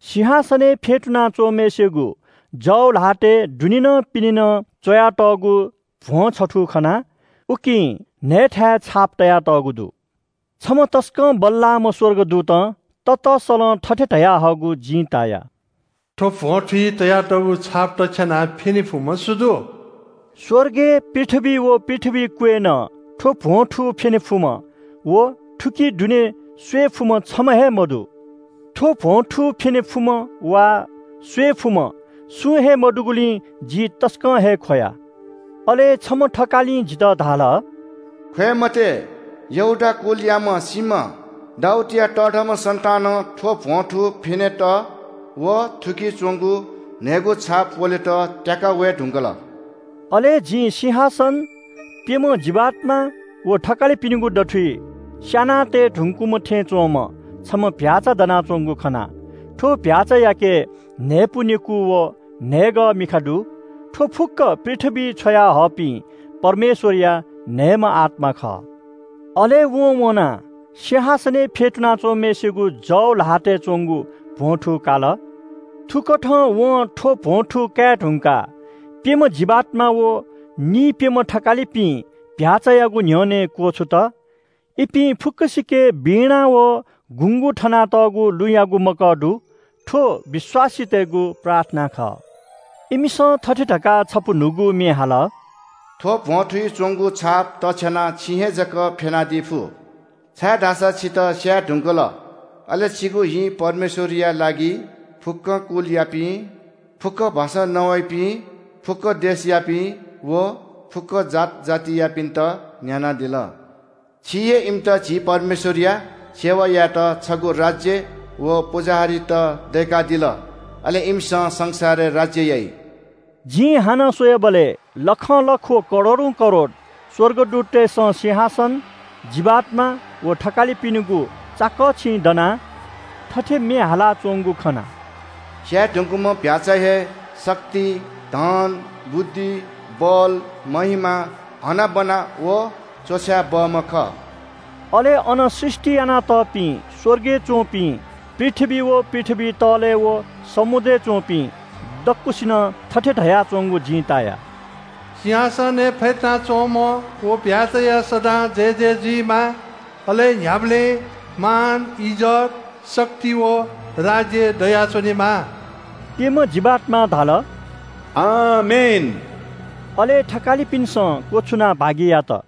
सिंहासनय् फ्‍यतुना च्‍वंम्‍हय्‌सिगु जव ल्‍हातय् दुने नं पिने नं च्‍वयातःगु भ्‍वं छथू खना। उकी न्‍हय्‌थाय् छाप तयातःगु दु। छम्‍ह तसकं बल्‍लाःम्‍ह स्‍वर्गदूतं ततसलं थथे धयाच्‍वंगु जिं ताया – “थ्‍व भ्‍वंथुइ तयातःगु छाप तछ्यानाः फ्‍यने फुम्‍ह सु दु?” स्‍वर्गय्, पृथ्‍वीइ व पृथ्‍वी क्‍वय् नं थ्‍व भ्‍वंथू फ्‍यने फुम्‍ह व थुकी दुने स्‍वये फुम्‍ह छम्‍ह हे मदु। थ्‍व भ्‍वंथू फ्‍यने फुम्‍ह वा स्‍वये फुम्‍ह सुं हे मदुगुलिं जि तसकं हे ख्‍वया। अले छम्‍ह थकालिं जितः धाल – “ख्‍वय् मते, यहूदा कुलयाम्‍ह सिंह, दाऊदया तःधंम्‍ह सन्‍तानं थ्‍व भ्‍वंथू फ्‍यनेत व थुकी च्‍वंगु न्‍हय्‌गू छाप प्‍वलेत त्‍याकाः वये धुंकल।” अले जिं सिंहासन, प्‍यम्‍ह जीवात्‍मा व थकालिपिनिगु दथुइ स्‍याना तये धुंकूम्‍ह थें च्‍वंम्‍ह छम्‍ह चीधिकःम्‍ह भ्‍याःचा दनाच्‍वंगु खना। थ्‍व चीधिकःम्‍ह भ्‍याःचायाके न्‍हय्‌पु नेकू व न्‍हय्‌गः मिखा दु। थ्‍व फुक्‍क पृथ्‍वीइ छ्वयाहःपिं परमेश्‍वरया न्‍हय्‌म्‍ह आत्‍मा खः। अले वं वनाः सिंहासनय् फ्‍यतुना च्‍वंम्‍हय्‌सिगु जव ल्‍हातय् च्‍वंगु भ्‍वंथू काल। थुकथं वं थ्‍व भ्‍वंथू काये धुंकाः प्‍यम्‍ह जीवात्‍मा व निइप्‍यम्‍ह थकालिपिं चीधिकःम्‍ह भ्‍याःचायागु न्‍ह्यःने क्‍वछुत। इपिं फुक्‍कसिके वीणा व गुँगू थनातःगु लुँयागु मकः दु। थ्‍व विश्‍वासीतय्‌गु प्रार्थना खः। इमिसं थथे धकाः छपु न्‍हूगु म्‍ये हाल – “थ्‍व भ्‍वंथुइ च्‍वंगु छाप तछ्यानाः छिं हे जक फ्‍यनादी फु, छाय्‌धाःसा छितः स्‍याये धुंकल, अले छिगु हिं परमेश्‍वरया लागि फुक्‍क कुलयापिं, फुक्‍क भाषां नवाइपिं, फुक्‍क देशयापिं व फुक्‍क जात जातियापिन्‍त न्‍यानादिल। छिं हे इमित झी परमेश्‍वरया सेवा यायेत छगू राज्‍य व पुजाहारीत दय्‌कादिल। अले इमिसं संसारय् राज्‍य याइ।” जिं हानं स्‍वयाबलय् लखंलख व करोडौं करोड स्‍वर्गदूततय्‌सं सिंहासन, जीवात्‍मा व थकालिपिनिगु चाकःछिं दनाः थथे म्‍ये हाला च्‍वंगु खना – “स्‍याये धुंकूम्‍ह चीधिकःम्‍ह भ्‍याःचा हे शक्ति, धन, बुद्धि, बल, महिमा, हनाबना व तःधंके बहःम्‍ह खः।” अले अन सृष्‍टि यानातःपिं स्‍वर्गय् च्‍वंपिं, पृथ्‍वी व पृथ्‍वी तःले व समुद्रय् च्‍वंपिं दक्‍वसिनं थथे धयाच्‍वंगु जिं ताया – “सिंहासनय् फ्‍यतुनाच्‍वंम्‍ह व चीधिकःम्‍ह भ्‍याःचाया सदां जयजय जुइमा। अले न्‍ह्याबलें मान, इज्‍जत, शक्ति व राज्‍य दयाच्‍वनेमा।” प्‍यम्‍ह जीवात्‍मां धाल – “आमेन!” अले थकालिपिन्‍सं क्‍वछुनाः भागि यात।